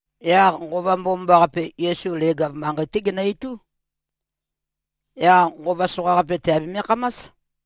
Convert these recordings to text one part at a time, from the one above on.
Yaq Nqova Mbomambaqape, Yesu leg-av manqei-té genø-itú. Yaq nqova soqaqape tèabeme-khamás.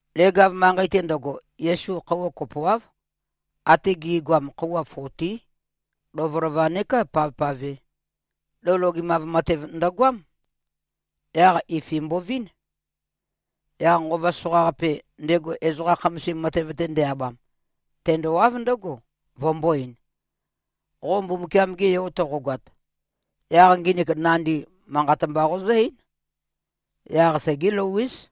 Leg-av manqei-te ndøgo, Yesu khøuwa kopoáv, ate gi꞉goam, khøuwa fotí, lovølova neká pavpave, lou logemav matev ndøgoám. Yaq ifin mbovín. Yaq nqova soqaqape, ndego ezoqa khamasim matev-te nde-abam, tendowáv ndǿgo, vømbō-ein, “Qo Mbumbukiam-ge Yo toqogoat, yaq nginik nandi, manqat mba qozǿ-eín. Yaq segé-lou-éz.”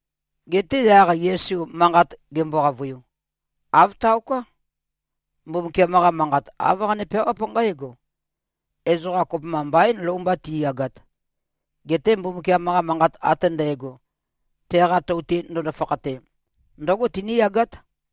Geté yaq Yesu manqat gembo-qavøiu, “Āv taoká. Mbumbukiam-qa Manqat, āv qane-peawáp nqǽgo, ‘Ezoqa kopømba mbaín lou mba ti꞉yagat. Geté Mbumbukiam-qa manqat ate ndægo, teqa tou-te ndøndo-fakhate, ndǿgo tiníyagát.’”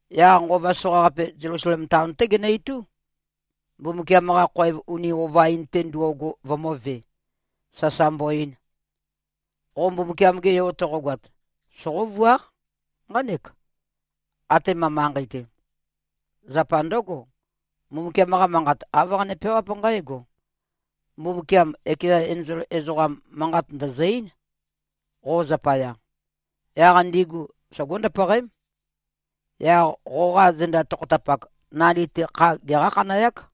Yaq nqova soqaqape, Zelusalem taon-té genø-itú, Mbumbukiam-qa khoev uni ova-in ndo꞉go vømø̄ve, sasa mbo-ein, “Qo Mbumbukiam-ge Yo toqogoat, soqóvuáq nqánek, atema manqei-te. Zapa ndǿgo, Mbumbukiam-qa Manqat, āv qane-peawáp nqǽgo, ‘Mbumbukiam ekeza enzol ezoqam, manqat ndø̀zø-eín, qo zapaya. Yaq ndigu sogó-ndøpøqém. Yaq qoqa zenda tokhotapak, nandi-te kha geqá-khanøyák.’”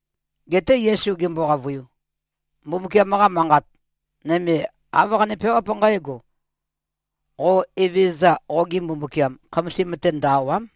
Geté Yesu gembo-qavøiu, “Mbumbukiam-qa Manqat nøme, āv qane-peawáp nqǽgo, ‘Qo Evezøza, qoge Mbumbukiam, khamasim-te ndø-àwa᷄m.’”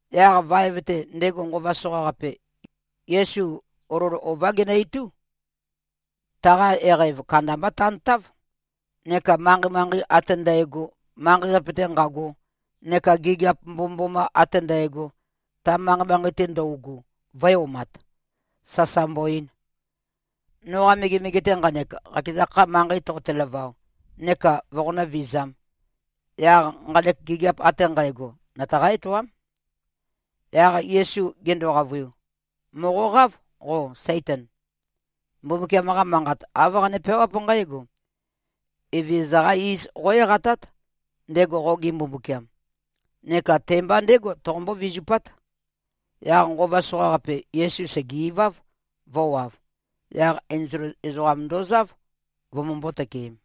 Yaq vaev-te, ndego nqova soqaqape, Yesu olol ová genø-itú, taqa eqæv kandambá tantáv, neka manqei-manqei ate ndægo, manqei-qape-te nqago, neka gigiap mbomømboma ate ndægo, ta manqei-manqei-te ndøugu, vø̄e-omat, sasa mbo-ein, “Noqa megemege-te nqanek, qakeza kha, manqei toqote-lavao, neka voqonǿ-vizām, yaq nqanek gigiap ate nqægo, nøtaqá-etoám.” Yaq Yesu gendo-qavøiu, “Mòqoqáv qo, Saitan. Mbumbukiam-qa Manqat, āv qane-peawáp nqǽgo, ‘Evezøza-qá iz qó-eqatát, ndego qoge Mbumbukiam. Neka te-mba ndégo, toqombó-vizupát.’” Yaq nqova soqaqape, Yesu sège-iváv, vø̄wav. Yaq enzol ezoqam ndozáv, vømømbō-tøkeem.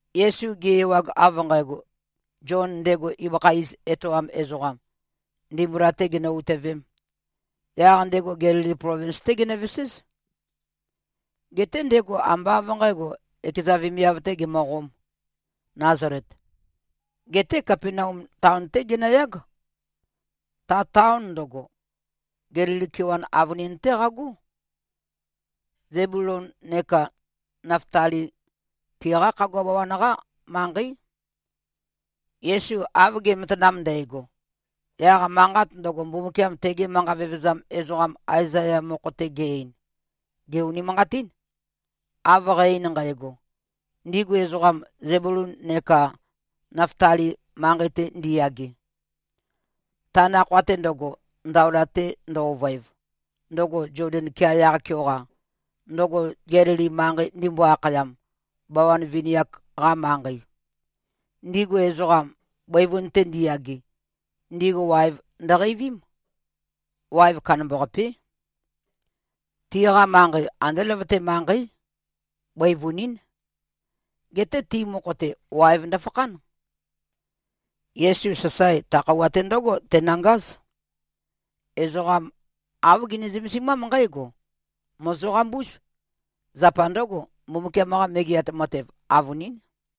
Yesu ge-ewag av nqægo, Zion ndego ibøkha iz etoam ezoqam, ndimbula-tē ginø-utøvēm, yaq ndego Gelili plovins-té genøveséz. Geté ndego ambá av nqǣgo, ekeza vemiav-tē gemøqōm, Nazalet, geté Kapenaum taon-té genøyág. Ta taon ndøgo, Gelili kewan avønin-té qagó. Zebulon neka Naftali, tiqá khagua bawan-qá manqeí. Yesu av ge꞉matanam ndægo, yaq manqat ndøgo, Mbumbukiam tege manqa vevezam ezoqam Aezaya mokho-te ge-ein, gè-unimanqatín, av qæ-ein nqægo, “Ndigu ezoqam, Zebulon neka Naftali manqei-te ndiyage, ta nakhoa-te ndøgo, ndaola-te ndø-ovøev, ndøgo Zoden kea yaq-keoqa, ndøgo Gelili manqei ndimbo-akhayam, bawan vini-ak-qa manqei, ndigu ezoqam, bøivun-te ndiyage, ndigu waev ndøqeivím. Waev kandambaqapé. Tiqa manqei andé løvøte manqeí. Bøivunín. Geté ti mokho-te, waev ndøfakhán.” Yesu, sasae, ta khøuwa-té ndǿgo tenøngáz. Ezoqa āv gene-zømesimám nqǽgo, “Mòzoqambúz. Zapa ndǿgo, Mbumbukiam-qa Megeat Matev avønín.”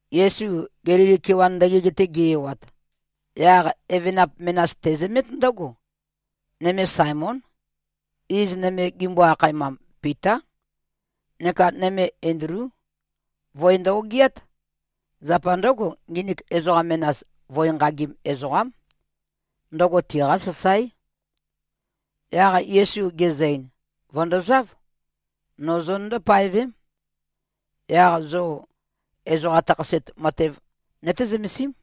Yesu Gelili kewan ndøgeg-te ge-ewat, yaq evenap menas tezømét ndǿgo. Nøme Saemón. Iz nøme gimbo-akhaemam, Pitá. Neka nøme, Endlú. Voe ndø-ogiát. Zapa ndǿgo, nginik ezoqa menas, voe nqagim ezoqám. Ndøgo tiqá sasáe. Yaq Yesu gezø-ein, “Vø̀ndozáv. No zonøndó-paevém. Yaq zo ezoqa takhaset matev nøté-zømesím.”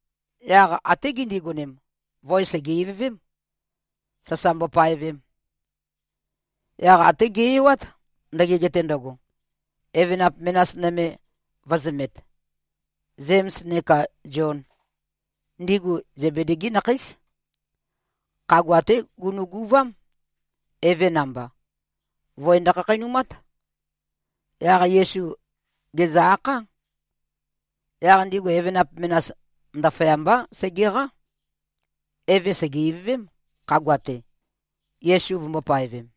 Yaq até gindigonem, voe sège-ivøvém, sasa mbopaevem. Yaq até ge-ewát, ndøgeg-te ndøgo, evenap menas nøme vø̄zømet, Zēms neka Zion. Ndigu Zebedi-gí nakheís. Khagua-té gunuguvám, eve namba. Voe ndøkhakheinumát. Yaq Yesu gèzø-akhá. Yaq ndigu evenap menas, ndaføyambá, sègeqá. Eve sège-ivøvém, khagua-te, Yesu vømbō-paevem.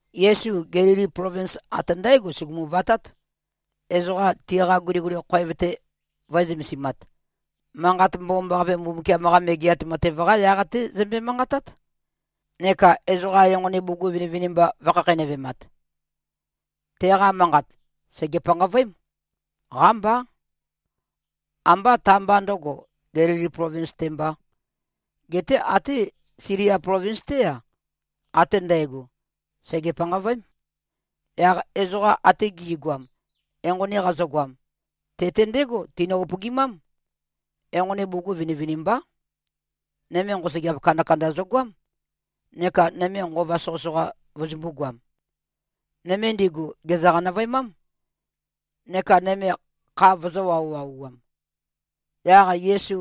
Yesu Gelili plovins ate ndǽgo sugumu-vatát, ezoqa tiqa guliguli khoev-te vø̄e-zømesimat. Manqat Mbomambaqape, Mbumbukiam-qa Megeat Matev-qá yaq-té zømbe-manqatát, neka ezoqa enqoni bugug vinivinimba vø̄khakheinøvemat. Teqa manqat, sège-panqavøém. Qámbá. Ambá ta-mba ndø̄go, Gelili plovins-te mbā, geté até Silia plovins-té-a, ate ndægo, sège-panqavøém. Yaq ezoqa ate gi꞉goam, enqoni qazøgoam, te-te ndégo tinø-upøgimám. Enqoni bugug vinivinimbá. Nøme nqosøgeap kandakanda zøgoám neka nøme nqova soqøsoqa vøzømbū-goam. Nøme ndigu gèzø-qanøvøemám, neka nøme kha vøzø̄-wauwauwam. Yaq Yesu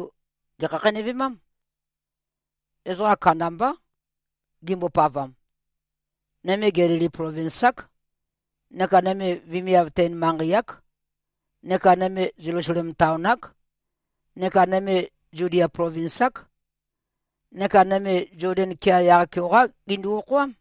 gèkhakheinøvemám. Ezoqa kandambá gimbopavam. Nøme, Gelili plovins-ák, neka nøme vemiav-ten-manqei-ák neka nøme Zelusalem taon-ák, neka nøme Zudia plovins-ák. Neka nøme Zoden kea yaq-keoqá gindu-okhoám.